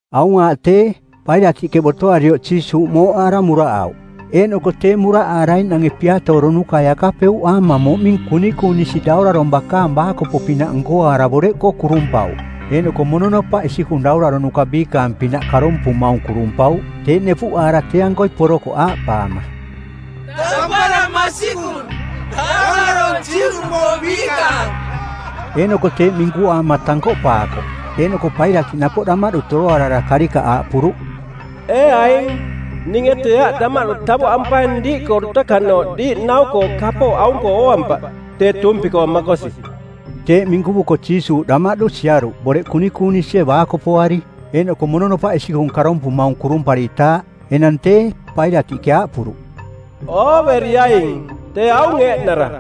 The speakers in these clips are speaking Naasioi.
Aung aaꞌ tee, Pailatiꞌke botoarioꞌ Jiisuuꞌ mooꞌaara muraꞌauꞌ. Eeꞌnoko tee muraꞌaaraiꞌnange piatooronukai akapeuꞌaama moꞌming kunikunisi daurarong˜ bakaang baakopo-pinaꞌ nkoaara boreꞌkoo kurumpauꞌ, eeꞌnoko mononopaꞌ isikung dauraronuka biikaang-pinaꞌ karompumaung, kurumpauꞌ. Teeꞌ nepuꞌaara tee-ankoi porokoꞌ aaꞌpaama, “Tampara masikung, Daurarong Juꞌnupoong Biikaang!” Eeꞌnoko teeꞌ minkuaama tankoꞌpaakoꞌ. Eeꞌnoko Pailatiꞌ napoꞌ damaꞌdu toroarara karikaꞌ aaꞌpuruꞌ, “Ee aing, ninge tee aꞌ damaꞌdu tavoꞌampaing diiꞌkoo dutakanooꞌ diiꞌ nau-koo kapooꞌ aung-koo ooampaꞌ tee tuumpi-koo makosi.” Teeꞌ minkuvuko Jiisuuꞌ damaꞌdu siaruꞌ boreꞌ kunikunisie baakopoari, eeꞌnoko mononopaꞌ isikung karompumaung kurumparitaaꞌ. Enang tee, Pailatiꞌke aaꞌpuruꞌ, “Ooveriaing, tee aung eeꞌnara.”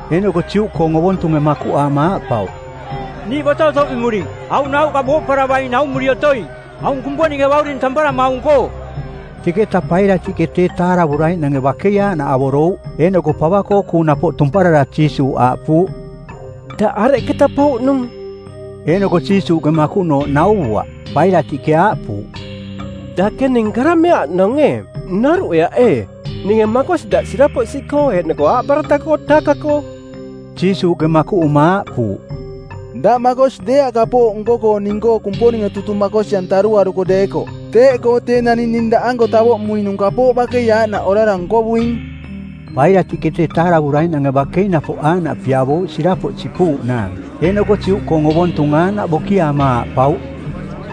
Eeꞌnoko Juꞌkoong ovontunge makuꞌaama aaꞌpauꞌ, “Niiꞌ boto otoꞌmemuring aung nauꞌka booꞌparavaing naumuri otoing, aung Kumponinge Bauring tamparamaung-koo.” Teketa Pailatiꞌke tee taaravuraiꞌnange bakei aaꞌnaꞌ avorouꞌ. Eeꞌnoko pava-koo kuung napoꞌ tumparara Jiisuuꞌ aaꞌpuuꞌ, “Daꞌ areketa pouꞌnung?” Eeꞌnoko Jiisuuꞌke makuꞌnooꞌ nauvuaꞌ. Pailatiꞌke aaꞌpuuꞌ, “Dake ning karameaꞌ oꞌnong ee? Noruꞌeaꞌ ee ninge makosi daꞌ sirapoꞌ siꞌkoo eeꞌnoko aaꞌbarataꞌkoo taaka-koo?” Jiisuuꞌke makuꞌuma aaꞌpuuꞌ, “Daꞌ makosi deeaꞌ kapooꞌ nko-koo ning-koo Kumponinge tutung makosi-antaruaruko deekoꞌ. Teeꞌkoo tee naning ning daꞌanko tavoꞌmuinung kapooꞌ bakei aaꞌnaꞌ orara nkovuing.” Pailatiꞌke tee taaravuraiꞌnange bakei napoꞌ aaꞌnaꞌ piavouꞌ sirapoꞌ sipuuꞌnaang. Eeꞌnoko Juꞌkoong ovontung aaꞌnaꞌ bokiaama aaꞌpauꞌ,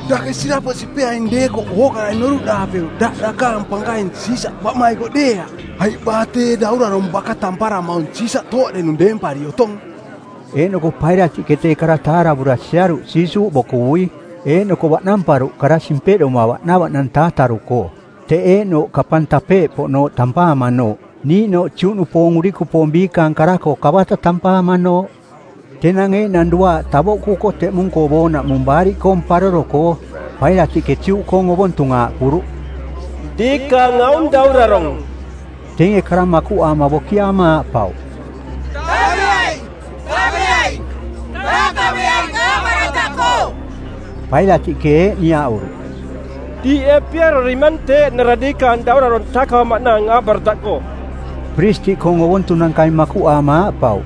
“Dake sirapoꞌ sipeaing deekoꞌ ookarai noruꞌdaapeuꞌ daꞌ dakaang pankaing Siisaꞌ baꞌmaikoꞌ deeaꞌ, aiꞌ baa tee daurarong baka tamparamaung Siisaꞌ tooꞌdenung deempari otong.” Eeꞌnoko Pailatiꞌke tee kara taaravura siaruꞌ Jiisuuꞌ bokuvui, eeꞌnoko baꞌnamparuꞌ kara simpeꞌdoma baꞌnavaꞌnang taataru-koo, teꞌ eeꞌnooꞌ Kapang Tapeeꞌpoꞌnooꞌ tampaamanooꞌ, niiꞌnooꞌ Juꞌnupoong urikupoong biikaang kara-koo Kabata tampaamanooꞌ. Tenang eeꞌnang duaaꞌ tavoꞌkuko teꞌmung-koo boonaꞌmung Baariꞌkoong˜ Paroro-koo. Pailatiꞌke Juꞌkoong ovontung aaꞌpuruꞌ, “Diikaang aung daurarong.” Teinge kara makuꞌaama bokiaama aaꞌpauꞌ, “Taveaing! Taveaing! Taakaveaing aaꞌbarataꞌkoo!” Pailatiꞌke eeꞌ niaꞌuruꞌ, “Diiꞌ ee piarorimang tee eeꞌnara diikaang daurarong taakavamaꞌnaang aaꞌbarataꞌkoo?” Piristiꞌkoong ovontunankai makuꞌaama aaꞌpauꞌ,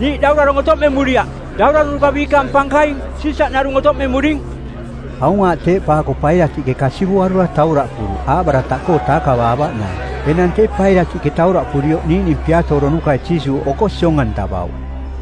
“Niiꞌ daurarong otoꞌmemuriaꞌ, dauraronuka biikaang pankaing, Siisaꞌ narung otoꞌmemuring.” Aung aaꞌ teeꞌpaako Pailatiꞌke kasivuarura tauraꞌpuruꞌ aaꞌbarataꞌkoo taakavaavaꞌnaang. Enang tee Pailatiꞌke tauraꞌpurioꞌ niiꞌning piatooronukai Jiisuuꞌ oko siong-antavauꞌ.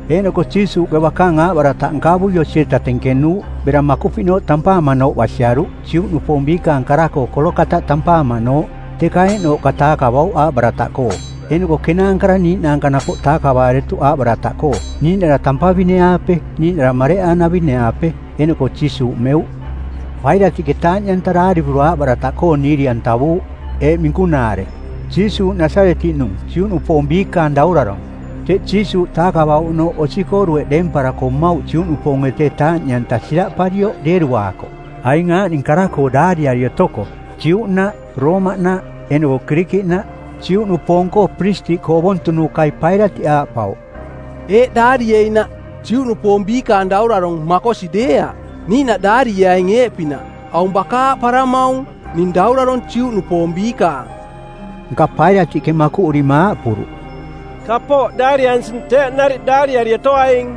Eeꞌnoko Jiisuuꞌke bakaang aaꞌbarataꞌ nkavui osi-eta tenkenuuꞌ bera Makupiꞌnooꞌ tampaamanooꞌ basiaruꞌ, Juꞌnupoong biikaang kara-koo Kolokataꞌ tampaamanooꞌ. Teka eeꞌnooꞌka taakavauꞌ aaꞌbarataꞌkoo. Eeꞌnoko kenaankara niiꞌnaanka napoꞌ taakavaaretuꞌ aaꞌbarataꞌkoo, niiꞌnara tampavine-aape, niiꞌnara mareꞌaanavine-aape, eeꞌnoko Jiisuuꞌ meuꞌ. Pailatiꞌke taaꞌniꞌanta daarivura aaꞌbarataꞌkoo niiri-antavuuꞌ eeꞌ minkunaare: “JIISUUꞌ NASARETIꞌNUNG, JUꞌNUPOONG BIIKAANG DAURARONG.” Teꞌ Jiisuuꞌ taakavauꞌnooꞌ osi-koo dueꞌ deemparako mmauꞌ Juꞌnupoonge tee taaꞌniꞌanta siraꞌparioꞌ deeruaakoꞌ, aing aaꞌning kara-koo daariari otoko: Juꞌnaꞌ, Roomaꞌnaꞌ, eeꞌnoko Kirikiꞌnaꞌ. Juꞌnupoong-koo piristiꞌkoo ovontunukai Pailatiꞌ aaꞌpauꞌ, “Eeꞌ daarieinaꞌ, ‘Juꞌnupoong Biikaang Daurarong,’ makosi deeaꞌ. Niiꞌnaꞌ daarieaing eeꞌpinaꞌ, ‘Aung baka aaꞌparamaung: Ning Daurarong Juꞌnupoong Biikaang.’” Nka Pailatiꞌke makuꞌurima aaꞌpuruꞌ, “Kapooꞌ daariansing teeꞌ nariꞌ daariari otoaing.”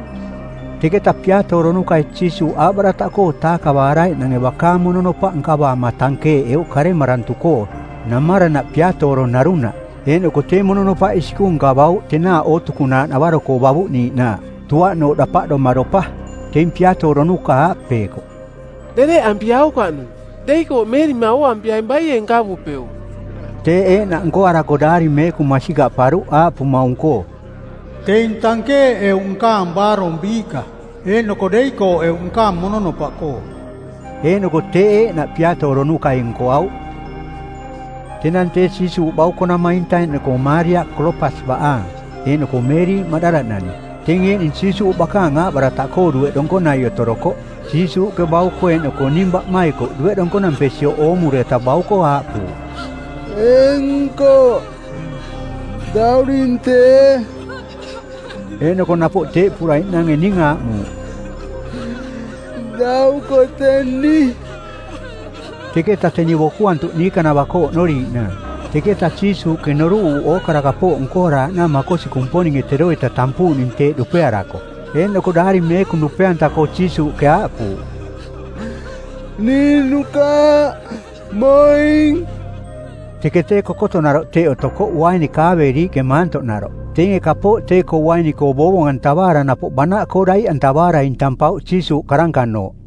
Teketa piatooronukai Jiisuuꞌ aaꞌbarataꞌkoo taakavaaraiꞌnange bakaang mononopaꞌ nkavaama tankeeꞌeuꞌ karemarantu-koo, namaranaꞌ piatooro narunaꞌ. Eeꞌnoko tee mononopaꞌ isikung nkavauꞌ tenaaꞌ ootukunaaꞌ navaro-koo bavuꞌniiꞌnaaꞌ, tuaꞌnooꞌ dapaꞌdoma dopa. Teing piatooronuka aaꞌpeekoꞌ, “Dereꞌampiaukaꞌnung, deikooꞌmeerima ooampiaing baie nkavupeuꞌ.” Teeꞌ eeꞌnaꞌ nkoarako Daari Meekung masikaꞌparuꞌ aaꞌpumaung-koo, “Teing tankeeꞌeuꞌ nkaang baarong biiꞌka, eeꞌnoko deikooꞌeuꞌ nkaang mononopaꞌkoo.” Eeꞌnoko teeꞌ eeꞌnaꞌ piatooronukai nkoauꞌ. Tenang tee Jiisuuꞌ bauko-namainta eeꞌnoko Maaria Kolopas baꞌaang, eeꞌnoko Meeriꞌ Maꞌdala-nani, teing eeꞌning Jiisuuꞌ bakaang aaꞌbarataꞌkoo dueꞌ donkonai otorokoꞌ. Jiisuuꞌke bauko eeꞌnoko ning baꞌmaikoꞌ dueꞌ donkonampesioꞌ oomureta bauko aaꞌpuuꞌ, “Ee nkoꞌ, dauring tee.” Eeꞌnoko napoꞌ teeꞌpuraiꞌnange ning aaꞌmuuꞌ, “Dauko teni.” Teketa teni bokuantuꞌ niikanava-koo oꞌnoriiꞌnaang. Teketa Jiisuuꞌke noruꞌuuꞌ ookara kapooꞌ nkoaraaꞌnaang makosi Kumponinge teroita tampuuꞌning teeꞌ dupearako. Eeꞌnoko Daari Meekung dupe-anta-koo Jiisuuꞌke aaꞌpuuꞌ, “Ning nukaaꞌmoing.” Teke tee kokotonaroꞌ teꞌ otokoꞌ uaini kaaveeriiꞌke maantoꞌnaroꞌ. Teinge kapooꞌ tee-koo uaini-koo boovong-antavaara napoꞌ banaꞌkoo daiꞌantavaara intampauꞌ Jiisuuꞌ karankanooꞌ.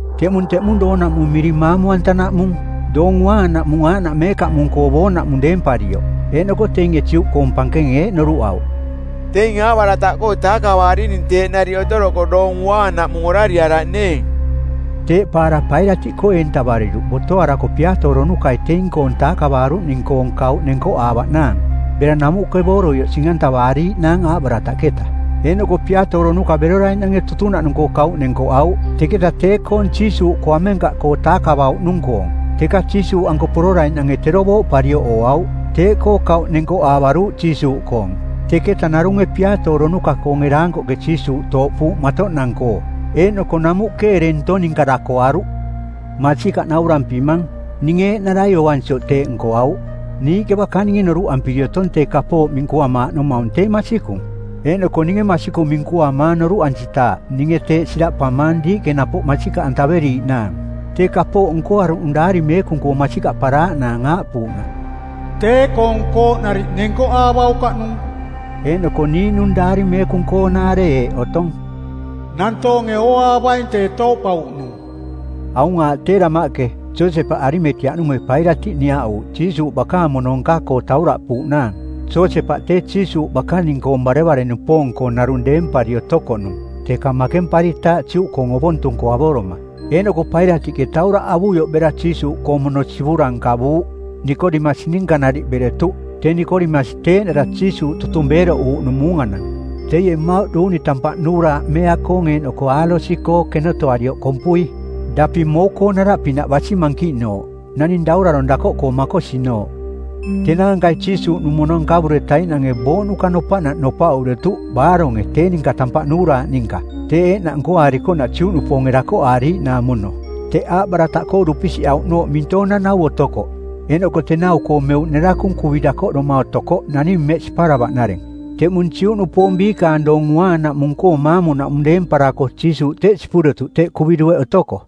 Teꞌmung teꞌmung doonaꞌmung miring Maamu-antanaꞌmung, doong uaanaꞌmung aaꞌnaꞌ meekaꞌmung-koo boonaꞌmung deemparioꞌ. Eeꞌnoko teinge Juꞌkoong pankenge eeꞌ noruꞌauꞌ, “Teing aaꞌbarataꞌkoo taakavarining teeꞌ nariꞌ otoroko Doong Uaanaꞌmung orariaraꞌneeng.” Teeꞌpaara Pailatiꞌkoo eentavariruꞌ botoarako piatooronukai teing-koong taakavaaruꞌning-koong kauꞌ nenkoꞌaavaꞌnaang, bera namuꞌke booroioꞌ sing-antavaariiꞌnaang aaꞌbarataꞌketa. Eeꞌnoko piatooronuka beroraiꞌnange tutunaꞌnung-koong kauꞌ nenkoꞌauꞌ, teketa tee-koong Jiisuuꞌkoo amenkaꞌkoo taakavauꞌnung-koong. Teka Jiisuuꞌanko pororaiꞌnange tero booꞌparioꞌ ooauꞌ, teeꞌkoo kauꞌ nenkoꞌaavaruuꞌ Jiisuuꞌkoong. Teketa narunge piatooronuka-koonge daankoꞌke Jiisuuꞌ tooꞌpuuꞌ matoꞌnang-koo, eeꞌnoko namuꞌke ereng ntong ninka dakoaruꞌ. Masikaꞌ naurampimang, ninge eeꞌnarai ooansioꞌ teeꞌ nkoauꞌ. Niiꞌke bakaninge noruꞌampiri otong tee kapooꞌ minkuamaaꞌnomaung tee masikung, eeꞌnoko ninge masikung minkuamaang noruꞌansitaaꞌ ninge teeꞌ siraꞌpamaang diiꞌke napoꞌ masikaꞌantaveriiꞌnaang. Tee kapooꞌ nkoaruꞌnung Daari Meekung masikaꞌparaaꞌnaang aaꞌpuuꞌnaꞌ, “Tee-koong kooꞌnariꞌ nenkoꞌaavaukaꞌnung.” Eeꞌnoko niiꞌnung Daari Meekung-koong nanaare eeꞌ otong, “Nantoonge ooaavaing tee tooꞌpauꞌnung.” Aung aaꞌ tee damaꞌke, Josepaꞌ Arimateaꞌnunge Pailatiꞌ niaꞌuuꞌ Jiisuuꞌ bakaang mono nka-koo tauraꞌpuuꞌnaang. Josepaꞌ tee Jiisuuꞌ bakaning-koong barevare-nupoong-koo narung deempari otokoꞌnung, teka makemparitaaꞌ Juꞌkoong ovontung-koo avoroma. Eeꞌnoko Pailatiꞌke tauraꞌ avuioꞌ bera Jiisuuꞌkoong mono sivura nkavuuꞌ. Nikodemasi ninka nariꞌ beretuꞌ. Tee Nikodemasi tee eeꞌnara Jiisuuꞌ tutung beeroꞌuuꞌnung muunganang. Teie mmauꞌ duuni tampaꞌ nuuraaꞌ meea-koong eeꞌnoko alosi-koo kenotoarioꞌ kompui, daping mou-koong naraꞌpinaꞌ basi mankiꞌnooꞌ, naning daurarong dakoꞌkoo makosinooꞌ. Tenaankai Jiisuuꞌnung mono nkavuretaiꞌnange booꞌnuka nopaꞌnaꞌ nopaꞌuretuꞌ baaronge tee ninka tampaꞌ nuuraaꞌ ninka, teeꞌ eeꞌnaꞌ nkoaarikoꞌnaꞌ Juꞌnupoonge dakoꞌaariiꞌnaang mono. Teꞌ aaꞌbarataꞌkoo dupisiꞌauꞌnooꞌ mintoong-nanau otokoꞌ, eeꞌnoko tenau-koo meuꞌ nerakung kuvi dakoꞌdoma otokoꞌ naning mmeꞌ siparavaꞌnareng. Teꞌmung Juꞌnupoong biikaang Doong Uaanaꞌmung-koo maamu-naꞌmung deemparako Jiisuuꞌ teꞌ sipuretuꞌ teꞌ kuvi dueꞌ otoko.